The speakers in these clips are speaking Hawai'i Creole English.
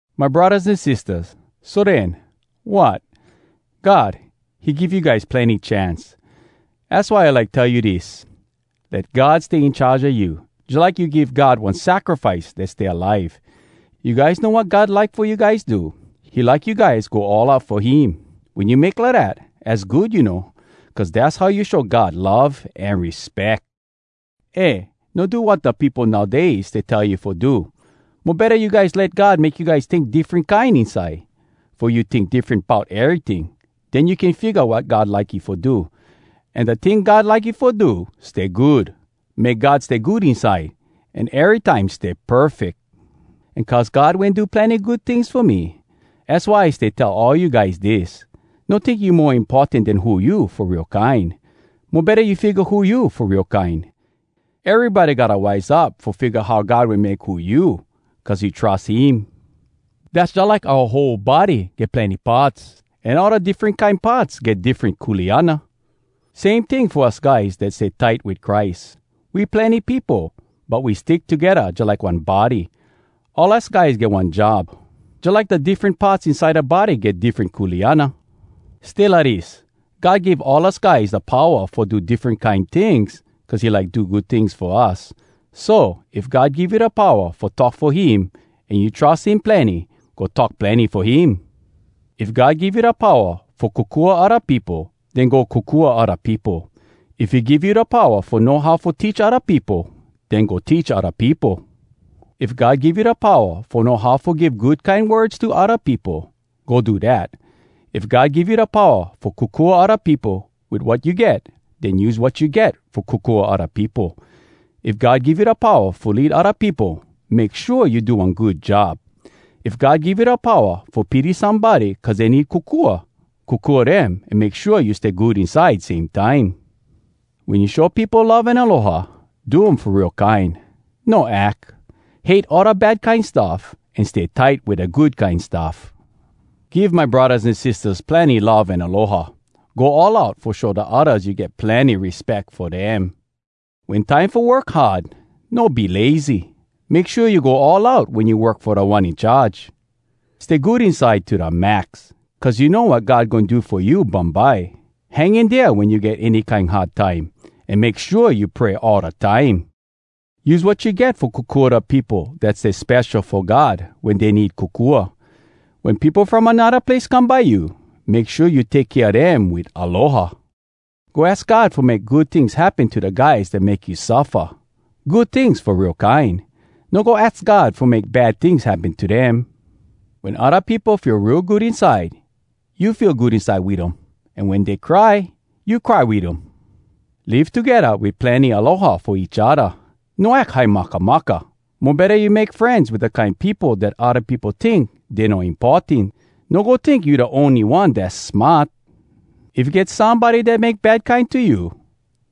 My braddahs an sistahs, so den, wat? God, he give you guys plenny chance. Az why I like tell you dis: Let God stay in charge a you, jalike you give God one sacrifice dat stay alive. You guys know wat God like fo you guys do? He like you guys go all out fo him. Wen you make lidat, az good you know, cuz dass how you show God love an respeck. Eh! No do wat da peopo nowdays stay tell you fo do! Mo betta, you guys let God make you guys tink diffren kine inside, fo you tink diffren bout eryting. Den you can figga wat God like you fo do. An da ting God like you fo do, stay good, make God stay good inside, an erytime stay perfeck. An cuz God wen do plenny good tings fo me, az why I stay tell all you guys dis: No tink you mo importan den who you fo real kine! Mo betta you figga who you fo real kine. Erybody gotta wise up fo figga how God wen make who you cuz you trus him. Dass jalike oua whole body get plenny parts, an all da diffren kine parts get diffren kuleana. Same ting fo us guys dat stay tight wit Christ—we plenny peopo, but we stick togedda jalike one body. All us guys get one job, jalike da diffren parts inside da body get diffren kuleana. Stay lidis: God give all us guys da powa fo do diffren kine tings cuz he like do good tings fo us. So, if God give you da powa fo talk fo him, an you trus him plenny, go talk plenny fo him. If God give you da powa fo kokua odda peopo, den go kokua odda peopo. If he give you da powa fo know how fo teach odda peopo, den go teach odda peopo. If God give you da powa fo know how fo give good kine words to odda peopo, go do dat. If God give you da powa fo kokua odda peopo wit wat you get, den use wat you get fo kokua odda peopo. If God give you da powa fo lead odda peopo, make shua you do one good job. If God give you da powa fo pity somebody cuz dey need kokua, kokua dem an make shua you stay good inside same time. Wen you show peopo love an aloha, do um fo real kine, no ack. Hate all da bad kine stuff, an stay tight wit da good kine stuff. Give my braddahs an sistahs plenny love an aloha. Go all out fo show da oddas you get plenny respeck fo dem. Wen time fo work hard, no be lazy. Make shua you go all out wen you work fo Da One In Charge. Stay good inside to da max, cuz you know wat God goin do fo you bumbye. Hang in dea wen you get any kine hard time. An make shua you pray all da time. Use wat you get fo kokua da peopo dat stay spesho fo God wen dey need kokua. Wen peopo from anodda place come by you, make shua you take kea dem wit aloha. Go aks God fo make good tings happen to da guys dat make you suffa, good tings fo real kine! No go aks God fo make bad tings happen to dem. Wen odda peopo feel real good inside, you feel good inside wit um—an wen dey cry, you cry wit um. Live togedda wit plenny aloha fo each odda. No ack high makamaka. Mo betta you make frenz wit da kine peopo dat odda peopo tink dey no importan. No go tink you da ony one dass smart. If get somebody dat make bad kine to you,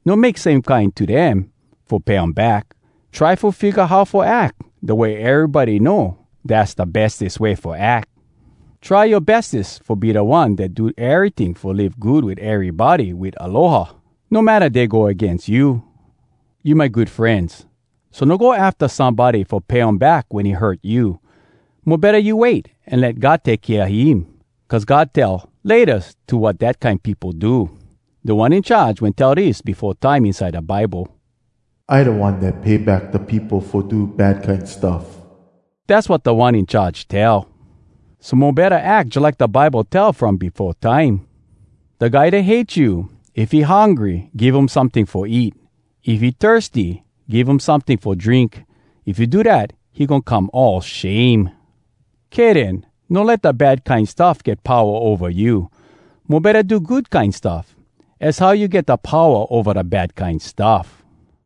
no make same kine to dem fo pay um back. Try fo figga how fo ack da way erybody know dass da bestes way fo ack. Try yoa bestes fo be da one dat do eryting fo live good wit erybody wit aloha, no matta dey go agains you. You my good frenz, so no go afta somebody fo pay um back wen he hurt you. Mo betta you wait, an let God take kea him, cuz God tell “Laytas” to wat dat kine peopo do. Da One In Charge wen tell dis befo time inside da Bible: “I da One dat pay back da peopo Fo do bad kine stuff.” Dass wat Da One In Charge tell. So mo betta ack jalike da Bible tell from befo time: “Da guy dat hate you— If he hungry, give um someting fo eat. If he thirsty, give um someting fo drink. If you do dat, he goin come all shame.” Kay den. No let da bad kine stuff get powa ova you. Mo betta do good kine stuff. Az how you get da powa ova da bad kine stuff.